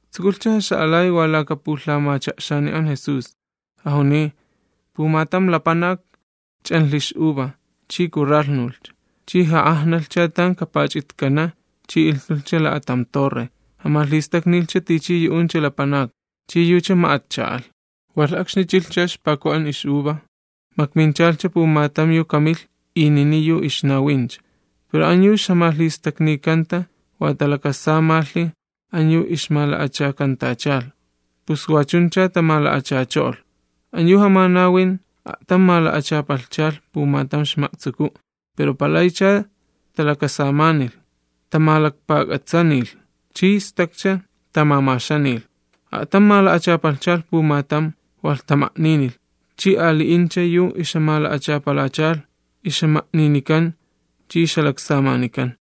Tsukulhcha jaxa'alay wa laka pulhamacha'xani an Jesús, jajuniy: ―Pumatam lapanak ch'anlhi ix'uva chi kurralhnulhcha, chi ja'ajnalhcha tan kapach'itkana', chi ilhtulhcha la'atam torre, jamach'ixta'nilhcha tichi yu'uncha lapanakni, chi yucha ma'atcha alh. Walh akxni chilhcha ixpaku an ix'uva, makminchalhcha pumatam yu kamilh inini yu ixnawincha. Pero an yu ixjamalhistaknikanta wa talakasamalhi an yu ixmala'achakantachalh, pus wachuncha tamala'achacho'olh. An yu jamanawin a'tam mala'achapalhchalh pumatam ixma'tsuku, pero palaycha talakasamanilh, tamalakpak'atsanilh, chi stakcha tamamaxanilh. A'tam mala'achapalhchalh pumatam, walh tama'ninilh. Chi ali'incha yu ixjamala'achapalachalh, ixjama'ninikan chi ixjalaksamanikan.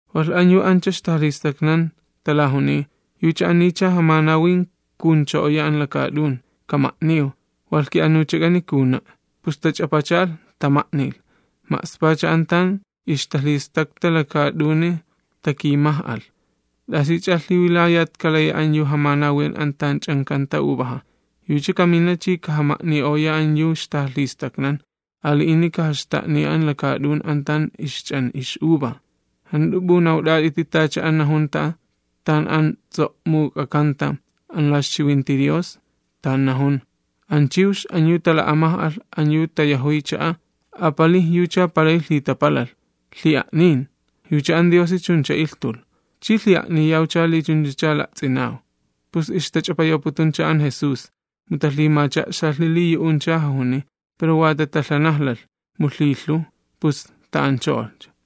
Walh an yu ancha ixtajalhistaknan talajuniy: “Yucha anicha jamanawin kajuncho'oya an lakaat'un. Kama'niw, walh ki'anuchak'ani kajuna'.” Pus tach'apachalh, tama'nilh, ma'spacha an tan ixtalhistakta lakaat'uni takimaj'alh. ’¿T'asich'a lhiwilayat kalaya an yu jamanawin an tan ch'ankanta uvaja? Yucha kamina chi kajama'ni'oya an yu ixtajalhistaknan, ali'ini kajaxta'niya an lakaat'un an tan ixch'an ix'uva. ’¿Jant'u p'unawt'at'iti tacha an najunta tan an ts'o'muk'akanta an la ixchiwinti Dios? Tan najun: An chiwx an yu tala'amaj'alh an yu tayajuy cha'a, apalij yucha palay lhitapalalh. Yucha an Diosi chuncha ilhtulh. Chi lhi'a'niyawcha li chunchacha la'ts'inaw. Pus ixtach'apayawputuncha an Jesús, mu talhimacha'xalhi li yu'uncha jajuniy, pero wa tatalhanajlalh, mu lhilhuw, pus ta'ancho'olhcha.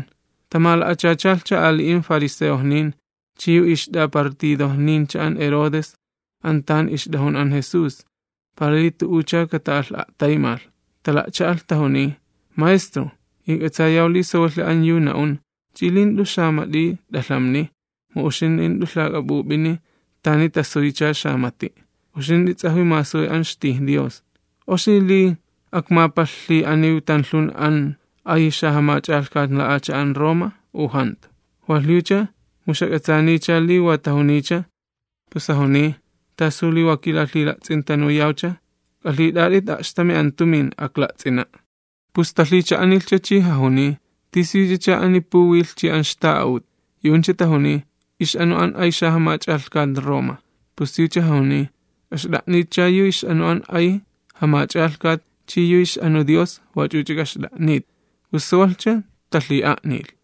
Tamala'achachalhcha ali'in fariseojnin chi yu ixt'apartidojnincha an Herodes an tan ixt'ajun an Jesús, para li tu'ucha kata'alh'a'taymalh. Tala'cha'alh tajuniy: ―Maestro, ijk'atsayaw li sawalhi an yu na'un chi li jant'u xamat'i t'alhamniy, mu uxint'i jant'u yu lhak'ap'up'in tani tasuycha xamati', uxint'i ts'ajwi masuy an ixtij Dios. ¿Oxi li akmapalhlhi'aniw tanlhun an ay xajamach'alhkat la'acha'an Roma u jantu? Walh yucha mu ixjak'atsaaniya li wa tajuniycha, pus jajuniy: ―¿Tasu li wa kilalhila'ts'intanuyawcha? K'alhit'at'it a'xtami an tumin, akla'ts'ina'. Pus talhicha'anilhcha chi jajuniy: ―¿Tisiyuchacha ani puwilh chi an ixta'a'ut? Yu'uncha tajuniy: ―Ix'anu an ay xajamach'alhkat Roma. Pus yucha jajuniy: ―K'axt'a'nitcha yu ix'anu an ay xajamach'alhkat Roma, chi yu ix'anu Dios wach'uch'a k'axt'a'nit. Pus sawalhcha talhi'a'nilh.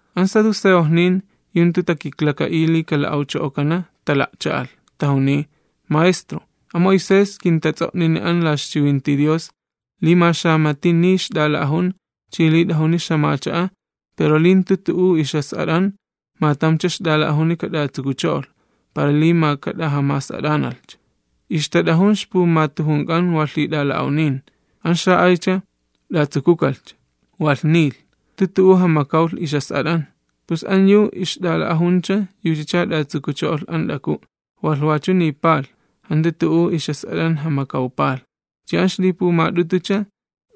An saduceojnin yu jantu takiklaka'iy li kala'awcho'okana tala'cha'alh, tajuniy: ―Maestro, a Moisés kintats'o'nini an la ixchiwinti Dios li ma xamati niy ixt'ala'ajun chi li t'ajuni ixt'iwi, pero li jantu tu'u ixjas'at'an, ma tamcha ixt'ala'ajuni kat'atsukucho'olh, para li ma kat'ajamas'at'analhcha. Ixtat'ajun ixpumatujunk'an wa lhit'ala'awnin. An xa'aycha t'atsukukalhcha, walh nilh, jantu tu'u jamakawlh ixjas'at'an. Pus an yu ixt'ala'ajuncha yuchacha t'atsukucho'olh an t'aku', walh wachu niipalh, jantu tu'u ixjas'at'an jamakawpalh. Chi an ixlipumat'utucha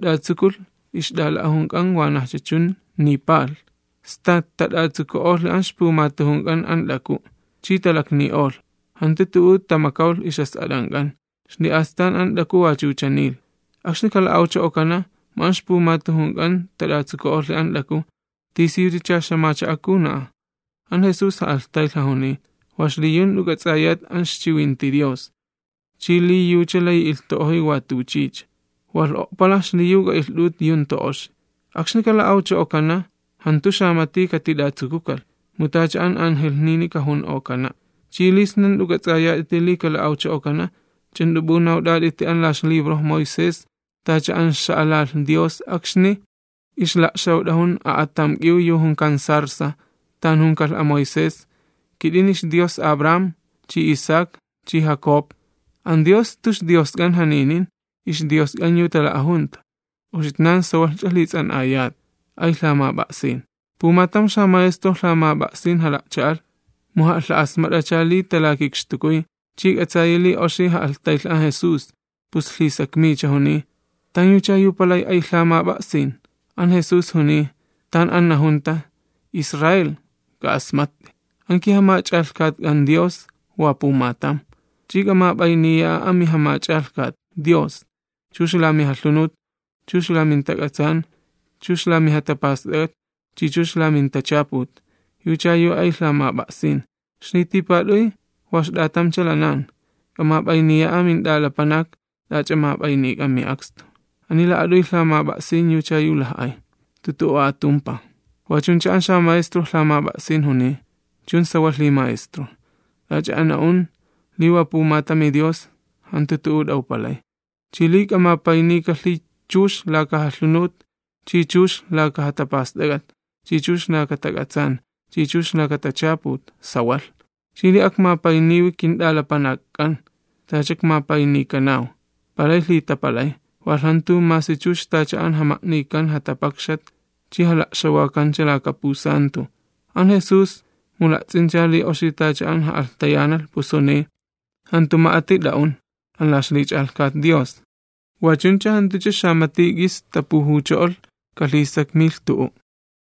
t'atsukulh ixt'ala'ajunk'an wanajcha chun, niipalh. Sta tat'atsuku'olhi an ixpumatujunk'an an t'aku', chi talakni'olh, jantu tu'u tamakawlh ixjas'at'ank'an, xli'astan an t'aku wachucha niilh. Akxni kala'awcho'okana, mu an ixpumatujunk'an tat'atsuku'olhi an t'aku, ¿tisiyuchacha ixt'iwi kajuna'a? An Jesús ja'alhtaylh jajuniy: ―Wa xliyu jant'u k'ats'ayat an ixchiwinti Dios, chi li yucha layi ilhtu'ojoy watuchicha, walh o'palaj xliyu k'a'ilht'ut yu jantu oxi. Akxni kala'awcho'okana, jantu xamati katit'atsukukalh, mu tacha an angelhnini kajun'okana'. Chi li sna jant'u k'ats'ayat'iti li kala'awcho'okana, ¿ch'u jant'u p'unawt'at'iti an la ixlibro Moisés, tacha an xa'alalh Dios akxni ixla'xawt'ajun a'atam k'iw yu junkan zarza, tan junikalh a Moisés: “Kit'ini ixDios Abraham, chi Isaac, chi Jacob?” An Dios jantu ixDiosk'an janinin, ixDiosk'an yu tala'ajunta. Uxitnan sawalhch'a lhits'an'ayat. Pumatam xamaestro lhamap'a'sin jala'cha'alh, mu ja'alha'asmat'acha li talakikxtukuy, chi k'atsayi li oxi ja'alhtaylh an Jesús, pus lhisakmiycha, juniy: ―¿Tanyucha yu palay ay lhamap'a'sin? An Jesús juniy: ―Tan an najunta: “Israel, k'a'asmatt'i, an kiJamach'alhkatk'an Dios, wa pumatam. Chi k'amap'ayniya'a amiJamach'alhkat Dios, chux la mijalhunut, chux la mintakuwin, chux la mijatapast'ak'at chi chux la mintachaput. Yucha yu ay lhamap'a'sin.” Ixlitipat'uy wa ixt'atamcha lanan: “K'amap'ayniya'a mint'alapanak t'ach'a map'aynik'an mi'akstu”. Ani la'at'uy lhamap'a'sin yucha yu laj'ay, jantu tu'u atumpaj. Wachuncha an xamaestro lhamap'a'sin juniy: ―Chun sawalhi Maestro, t'ach'a an na'un li wa pumatami Dios, jantu tu'u t'awpalay sawalh, chi li kamapaynikalhi chux laka jalhunut, chi chux laka jatapast'ak'at, chi chux laka tak'atsaan, chi chux laka tachaput, sawalh. Chi li akmapayniwi kint'alapanakk'an tacha ikmapaynikanaw, palay lhitapalay, walh jantu masi chux tacha an jama'nikan jatapakxat chi jala'xawakancha tan ma'axta'kan lha'ulan. An Jesús, mu la'ts'incha li oxi tacha an ja'alhtayanalh, pus juniy: ―Jantu ma'ati t'a'un an la ixlich'alhkat Dios. Wachuncha jantucha xamati k'is tapujucho'olh kalhisakmilh tu'u'.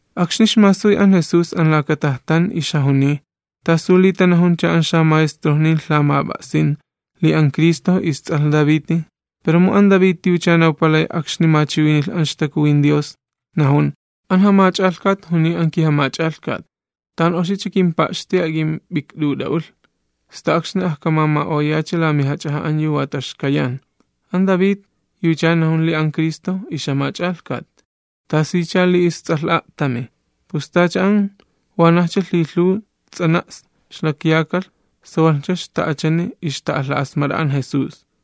Akxni ixmasuy an Jesús an laka tajtan ixjajuniy: ―¿Tasu li tanajuncha an xamaestrojnin lhamap'a'sin li an Cristo ists'alh Daviti? Pero mu an David yucha nawpalay akxni machiwinilh an ixtakuwin Dios, najun: “An Jamach'alhkat Dios juniy an kiJamach'alhkat Cristo: Tan oxicha kimpa'xti ak'imp'ikt'ut'a'ulh, sta akxni ajkamama'oyacha la mijach'aja an yu wa taxkayan.” An David yucha najun li an Cristo ixJamach'alhkat, ¿tasicha li ists'alh a'tami? Pus tacha an wanajcha lhilhuw ts'anaks ixlakyakalh sawalhcha ixta'achani ixta'alha'asmat'a an Jesús.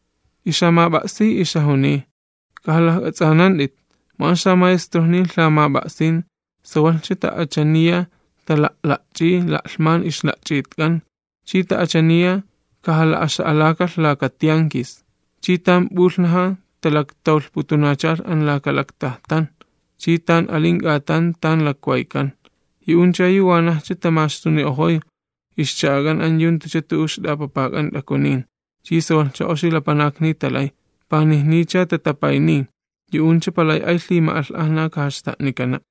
Ixjamap'a'siy ixjajuniy: ―K'ajalajk'ats'anant'it, mu an xamaestrojnin lhamap'a'sin sawalhcha ta'achaniya tala'la'ch'iy la'lhman ixla'ch'itk'an, chi ta'achaniya kajala'axa'alakalh laka tiankis. Chi tan p'ulhnaja talaktawlhputunachalh an laka lakcha'a tan pulakta'ayxto'kan, chi tan alin k'atan tan lakwaykan. Yu'uncha yu wanajcha tamaxtuni'ojoy ixcha'ak'an an yu jantucha tu'u ixt'apapak'an t'akunin. Chi sawalhcha oxi lapanakni talay, panijnicha tatapayniy. Yu'uncha palay ay lhima'alh'ajna kajaxta'nikana'.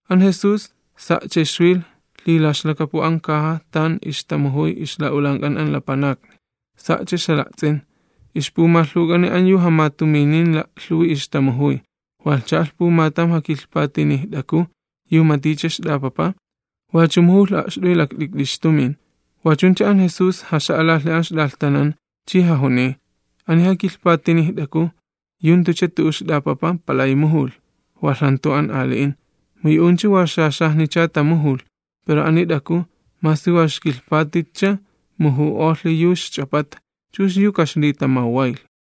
An Jesús sa'cha ixwilh lhilaxlakapu an caja tan ixtamujuy ixla'ulank'an an lapanakni, sa'cha ixjala'ts'in, ixpumalhuk'an an yu jamatuminin la'lhuwi ixtamujuy. Walh cha'alh pumatam jakilhpatinij t'aku yu maticha ixt'apapa, wachu mujulh a'xt'uy lakt'ikt'i ixtumin. Wachuncha an Jesús jaxa'alalhi an ixt'alhtanan, chi jajuniy: ―Ani jakilhpatinij t'aku yu jantucha tu'u ixt'apapa palay mujulh, walh jantu an ali'in. Mu yu'uncha wa xaxajnicha tamujulh, pero ani t'aku, masi wa ixkilhpatitcha muju'olhi yu ixch'apata, chux yu kaxlitamawwaylh.